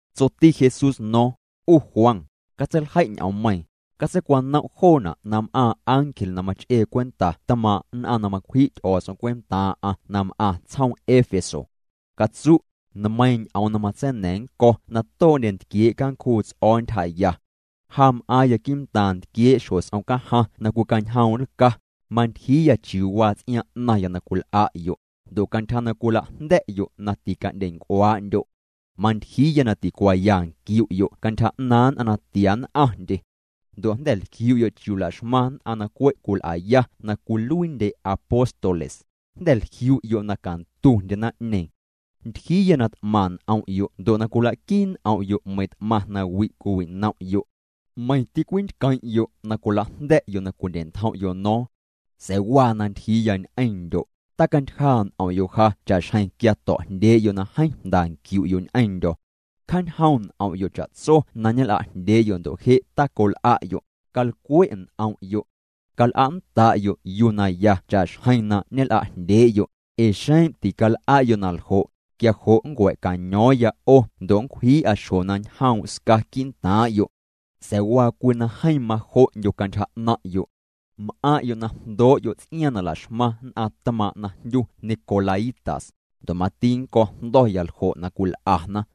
Tsoti Jesús no̱o̱ⁿ: —'U Juan, catseiljei' ñ'oommeiiⁿ, catseicwanom' joona' na m'aaⁿ ángel na mach'ee cwenta tmaaⁿ' nn'aⁿ na macwji' Ty'o̱o̱ts'om cwentaaⁿ'aⁿ na m'aⁿ tsjoom Éfeso. Catsu': “Nmeiiⁿ ñ'oom na matseina̱ⁿ nnco̱ na too'ndye ntquiee' cancjuu ts'o̱o̱ ntyjaya. Ja m'aaⁿya quii'ntaaⁿ ntquiee' xjo s'om cajaⁿ na cwicañjoom' nlca: Mantyjiiya chiuu waa ts'iaaⁿ 'naⁿya na cwil'a'yo', ndo' cantyja na cwila'jnda̱'yo' na tica'ndyenc'uaa'ndyo'. Mantyjiiya na ticuaaya nquiu'yo' cantyja 'naaⁿ nn'aⁿ na tia nn'aⁿndye. Ndo' jnda̱ jliu'yo' chiuu laxmaⁿ nn'aⁿ na cwe' cwil'aya na cwiluiindye apóstoles, jnda̱ jliu'yo' na cantundye naⁿ'ñeeⁿ. Ntyjiiya na t'maⁿ n'om'yo' ndo' na cwila'quii n'om'yo' meiiⁿ t'maⁿ nawi' cwiwi'nom'yo'. Meiⁿ tîcwintqueⁿ'yo' na cwila'jnda̱'yo' na cwindye'ntjom'yo' no̱o̱ⁿ. Sa̱a̱ waa na ntyjiiya ñ'eⁿndyo': tacantyjaa' n'om'yo' ja cha'xjeⁿ quia to̱'jndyee'yo' na jeeⁿ jnda nquiu'yo ñ'eⁿndyo̱. Cjaañjoom' n'om'yo' cha'tso na ñel'ajndyee'yo' ndo' je' tacol'a'yo', calcwe' n'om'yo'. Cal'a'nnda'yo' yuu na ya cha'xjeⁿ na ñel'a'jndyee'yo', Ee xeⁿ tical'a'yo' na ljo', quia jo' nncua̱caño̱o̱ⁿya 'o ndo' nncwji'a xjo na ñjoom' sca quii'ntaaⁿ'yo'. Sa̱a̱ waa cwii na jeeⁿ majo'ndyo cantyja 'naⁿ'yo'. M'aⁿ'yo' na jndoo'yo' ts'iaaⁿ na la'xmaⁿ nn'aⁿ tmaaⁿ' na jndyu nicolaítas, ndo' mati nnco̱ jndo̱ya ljo' na cwil'ana.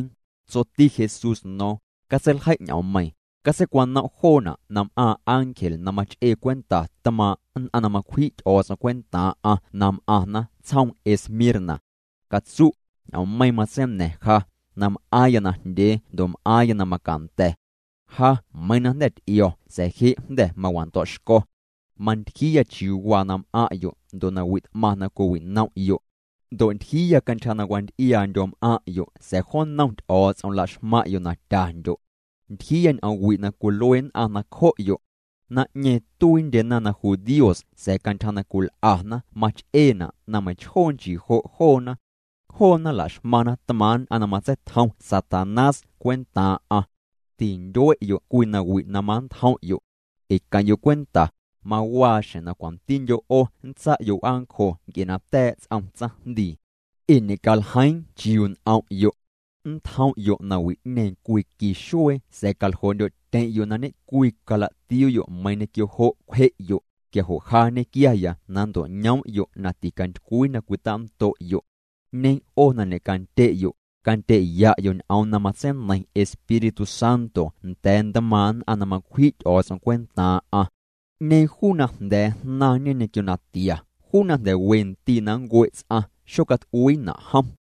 Tsoti Jesús no̱o̱ⁿ: —Catseiljei' ñ'oommeiiⁿ, catseicwanom' joona' na m'aaⁿ ángel na mach'ee cwenta tmaaⁿ' nn'aⁿ macwji' Ty'o̱o̱ts'om cwentaaⁿ'aⁿ na m'aⁿna tsjoom Esmirna. Catsu': “Ñ'oommeiiⁿ matseina̱ⁿ ja, na m'aaⁿya najndyee ndo' m'aaⁿya na macanda̱. Ja meiiⁿ na jnda̱ t'io̱ sa̱a̱ je' jnda̱ mawando̱'xco̱. Mantyjiiya chiuu waa na m'aⁿ'yo' ndo' nawi' t'maⁿ na cwiwinom'yo'. Ndo' ntyjiiya cantyja na wanty'iaandyo m'aⁿ'yo' sa̱a̱ jo nnom Ty'o̱o̱ts'om laxmaⁿ'yo' na tyandyo'. Ntyjiiya ñ'oom wi' na cwilue nn'aⁿ nacjo'yo'. Naⁿ'ñeeⁿ tuiindyena na judíos sa̱a̱ cantyja na cwil'ana mach'eena' na meiⁿchjoo nchii jo' joona. Joona la'xmaⁿna tmaaⁿ' nn'aⁿ na matseitjom Satanás cwentaaⁿ'aⁿ. Tintyue'yo' cwii nawi' na manntjom'yo'. Ee queⁿ'yo' cwenta, mawaa xjeⁿ na cwantindyo' 'o nntsa'yo' w'aancjo nc'e na ta̱a̱' ts'om tsaⁿjndii. Ee ñe'caljeiiⁿ chiuu n'om'yo'. Nntjom'yo' nawi'ñeeⁿ cwii qui xuee sa̱a̱ caljoo'ndyo'tyeⁿ'yo' na ñe'cwii cala'tiuu'yo' meiiⁿ ñequio jo' cwje'yo', quia jo' ja nñequiaya na nnto'ñoom'yo' na ticantycwii na cwitando'yo'. 'Ñeeⁿ 'o na ñe'candye'yo', candye'ya'yo' ñ'oom na matseineiⁿ Espíritu Santo nda̱a̱ ntmaaⁿ' nn'aⁿ na macwji' Ty'o̱o̱ts'om cwentaaⁿ'aⁿ: 'Ñeeⁿ juu na jnda̱a̱ jnaⁿñe ñequio natia, juu na jnda̱ we ndii' na nncue' ts'aⁿ, xocat'uiina' jom.”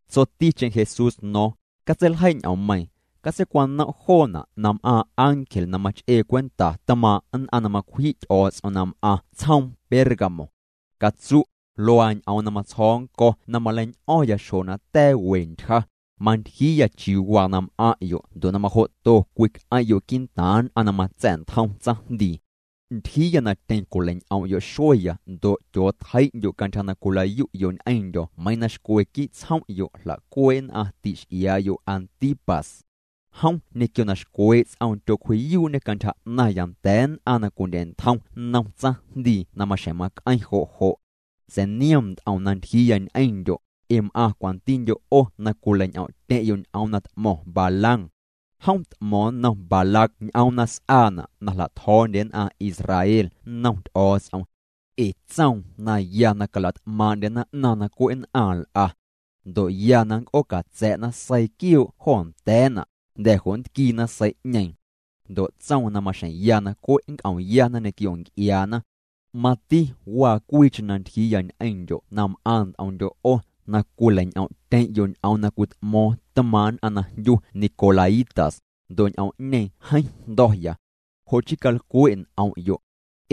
Tsoticheⁿ Jesús no̱o̱ⁿ: —Catseiljei' ñ'oommeiiⁿ, catseicwanom' joona' na m'aaⁿ ángel na mach'ee cwenta tmaaⁿ' nn'aⁿ cwentaa' Ty'o̱o̱ts'om na m'aⁿ tsjoom Pérgamo. Catsu': “Luaa ñ'oom na matsjo̱o̱ nnco̱ na maleiñ'o̱ⁿya xjo na ta̱a̱ we ntyja: Mantyjiiya chiuu waa na m'aⁿ'yo' ndo' na majo'to cwic'eⁿ'yo' quii'ntaaⁿ nn'aⁿ na matsa̱'ntjom tsaⁿjndii. Ntyjiiya na tyeⁿ cwilei'ñ'om'yo' xueya ndo' tyootjei'ndyo' cantyja na cwila'yu'yo' ñ'eⁿndyo̱ meiiⁿ na xcwe quii' tsjom'yo' jla'cuee' nn'aⁿ ti'x'iaa'yo' Antipas. Jom ñequio na xcwee' ts'oom tyocwji'yuu'ñê cantyja 'naⁿya nda̱a̱ nn'aⁿ na cwindye'ntjom nnom tsaⁿjndii na maxjeⁿ mac'eⁿ jo' jo'. Sa̱a̱ niom nt'om na ntyjiiya ñ'eⁿndyo', ee m'aⁿ cwantindyo' 'o na cwilei'ñ'om'tyeⁿ'yo' ñ'oom na t'mo̱ⁿ Balaam. Jom t'mo̱o̱ⁿ nnom Balac ñ'oom na s'aana' na jla'tjo̱o̱ndye nn'aⁿ Israel nnom Ty'o̱o̱ts'om. Ee tsoom na ya na cala't'maaⁿ'ndyena 'naⁿ na cwe' nn'aⁿ nl'a. Ndo' ya na nnc'oocatsa̱'na seii quioo' jo nda̱a̱na', jnda̱ jo' nntquiina sei'ñeeⁿ. Ndo' tsoom na maxjeⁿ ya na cwe' nc'omyana ñequio nc'iaana. Mati waa cwiicheⁿ na ntyjiiya ñ'eⁿndyo' na m'aⁿ nt'omndyo' 'o na cwilei'ñ'om'tyeⁿ'yo' ñ'oom na cwit'mo̱o̱ⁿ tmaaⁿ' nn'aⁿ na jndyu nicolaítas, ndo' ñ'oom'ñeeⁿ jeeⁿ jndo̱ya. Jo' chii calcwe' n'om'yo'.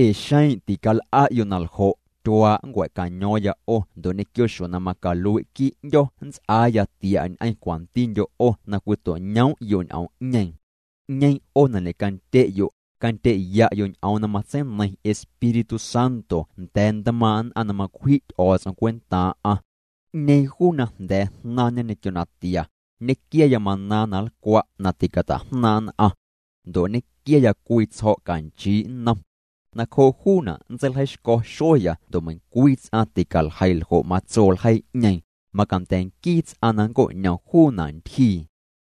Ee xeⁿ tical'a'yo' na ljo', tyuaa' nncua̱caño̱o̱ⁿya 'o ndo' ñequio xjo na macalui' quii' 'ndyo̱ nnts'aaya tia' ñ'eⁿ cwantindyo' 'o na cwito'ñoom'yo' ñ'oom'ñeeⁿ. 'Ñeeⁿ 'o na ñe'candye'yo', candye'ya'yo' ñ'oom na matseineiⁿ Espíritu Santo nda̱a̱ ntmaaⁿ' nn'aⁿ na macwji' Ty'o̱o̱ts'om cwentaaⁿ'aⁿ. 'Ñeeⁿ juu na jnda̱a̱ jnaⁿñe ñequio natia, nñequiaya maná na nlcwa' na ticata'jnaaⁿ' nn'aⁿ. Ndo' nñequiaya cwii tsjo̱' canchii' nnom. Nacjoo' juuna' nntseiljeixco̱ xueya ndo' meiⁿcwii ts'aⁿ ticaljeii ljo' matso ljeii'ñeeⁿ, macanda̱ nquii ts'aⁿ na nnco'ñom juuna' ntyjii.”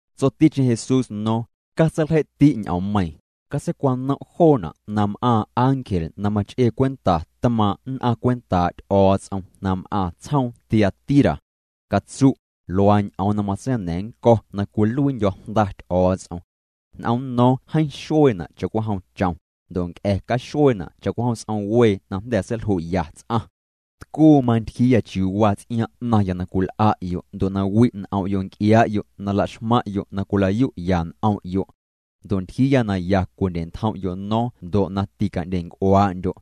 Tsoticheⁿ Jesús no̱o̱ⁿ: —Catseiljei'ti' ñ'oommeiiⁿ, catseicwanom' joona' na m'aaⁿ ángel na mach'ee cwenta tmaaⁿ' nn'aⁿ cwentaa' Ty'o̱o̱ts'om na m'aⁿ tsjoom Tiatira. Catsu': “Luaa ñ'oom na matseina̱ⁿ nnco̱ na cwiluiindyo̱ Jnda Ty'o̱o̱ts'om. N'omno̱o̱ⁿ jeeⁿ xueena' cha'cwijom chom, ndo' nc'a̱ caxueena' cha'cwijom s'om wee na jnda̱ seilju'ya ts'aⁿ. Tcuu mantyjiiya chiuu waa ts'iaaⁿ 'naⁿya na cwil'a'yo' ndo' na wi' n'om' nc'iaa'yo' na la'xmaⁿ'yo' na cwila'yu'ya n'om'yo'. Ndo' ntyjiiya na ya cwindye'ntjom'yo' no̱o̱ⁿ ndo' na tica'ndyenc'uaa'ndyo'.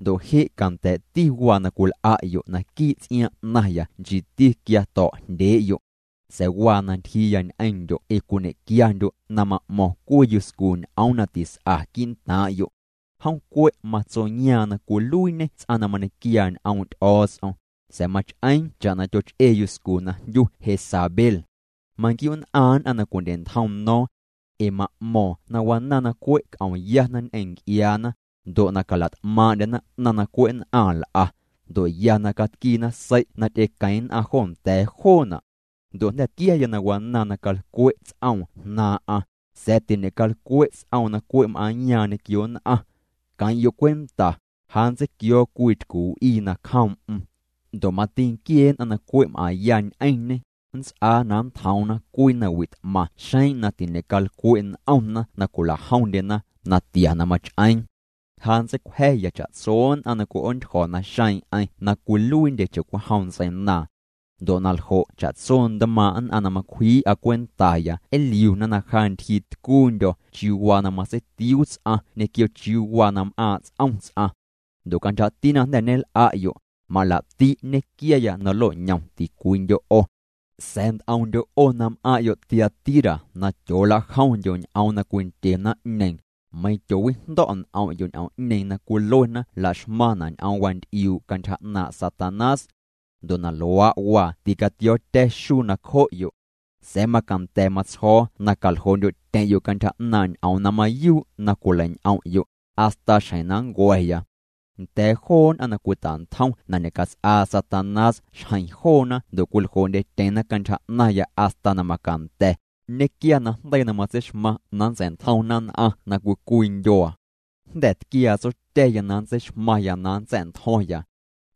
Ndo' je' canda̱a̱'ti waa na cwil'a'yo' naquii' ts'iaaⁿ 'naⁿya nchiiti quia to̱'jndyee'yo'. Sa̱a̱ waa na ntyjiiya ñ'eⁿndyo' ee cwiñe'quiandyo' na ma'mo̱ⁿ cwii yuscu ñ'oom na tis'a quii'ntaaⁿ'yo'. Jom cwe' matsoyaaⁿ na cwiluiiñê ts'aⁿ na mañequiaa ñ'oom' Ty'o̱o̱ts'om, sa̱a̱ mach'eeⁿ cha'na tyoch'ee yuscu na jndyu Jezabel. Manquiu'nn'aaⁿ nn'aⁿ na cwindye'ntjom no̱o̱ⁿ. Ee ma'mo̱o̱ⁿ na wanaaⁿ na cwe' c'omyana ñ'eⁿ nc'iaana, ndo' na cala't'maaⁿ'ndyena 'naⁿ na cwe' nn'aⁿ nl'a, ndo' ya na catquiina sei' na ty'equeⁿ nn'aⁿ jo nda̱a̱ joona'. Ndo' jnda̱ tquiaya na wanaaⁿ na calcwe' ts'oom jnaaⁿ'aⁿ, sa̱a̱ tiñe'calcwe' ts'oom na cwe' m'aaⁿyaaⁿ ñequio nn'aⁿ. Queⁿ'yo' cwenta, ja nntseiquio̱o̱ cwii tycu w'ii nacjoom'm. Ndo' mati nquiee nn'aⁿ na cwe' m'aⁿya ñ'eⁿñê, nnts'aa na nntjoomna cwii nawi' t'maⁿ xeⁿ na ticalcwe' n'omna na cwila'jomndyena natia na mach'eeⁿ. Ja nntseicwja̱ya cha'tso nn'aⁿ na cwi'oontyjo̱ naxeeⁿ'eⁿ na cwiluiindye cha'cwijom ntseinaaⁿ. Ndo' na ljo' cha'tso ntmaaⁿ' nn'aⁿ na macwjii'a cwentaya nliuna na ja ntyjiitcuundyo̱ chiuu waa na matseitiuu ts'aⁿ ñequio chiuu waa na m'aaⁿ' ts'om ts'aⁿ. Ndo' cantyjati na jnda̱ ñel'a'yo', malaa'ti' nñequiaya na nlo'ñom ticwiindyo' 'o. Sa̱a̱ nt'omndyo' 'o na m'aⁿ'yo' Tiatira na tyoolajomndyo' ñ'oom na cwindye naⁿ'ñeeⁿ, meiⁿ tyoowijndo̱' n'om'yo' ñ'oom'ñeeⁿ na cwiluena la'xmaⁿna' ñ'oom wanty'iuu' cantyja 'naaⁿ' Satanás. Ndo' na luaa' waa ticatio̱o̱tya̱ xuu nacjo'yo'. Sa̱a̱ macanda̱ matsjo̱o̱ na caljoo'ndyo'tyeⁿ'yo' cantyja 'naaⁿ' ñ'oom na mayuu' na cwilei'ñ'om'yo', hasta xjeⁿ na nncua̱ya. Nda̱a̱ joo nn'aⁿ na cwita'ntjom na ñe'cats'aa Satanás xjeⁿ joona ndo' cwiljoo'ndyetyeⁿna cantyja 'naⁿya hasta na macanda̱, nñequia najndeii na matseixmaⁿ na nntsa̱'ntjomna nn'aⁿ na cwii cwii ndyuaa. Jnda̱ tquiaa Tsotya̱ya na nntseixmaⁿya na nntsa̱'ntjo̱ⁿya.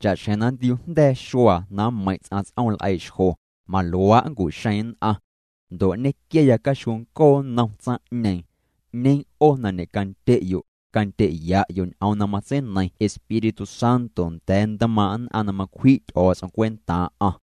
Cha'xjeⁿ na nntiuujnda̱a̱ xuaa na mmeiⁿ' ts'aⁿ ts'ooml'eii'xjo, maluaa' nncu'xeeⁿ nn'aⁿ. Ndo' nñequiaya caxjuuncoo nnom tsaⁿ'ñeeⁿ. 'Ñeeⁿ 'o na ñe'candye'yo', candye'ya'yo' ñ'oom na matseineiⁿ Espíritu Santo nda̱a̱ ntmaaⁿ' nn'aⁿ na macwji' Ty'o̱o̱ts'om cwentaaⁿ'aⁿ.”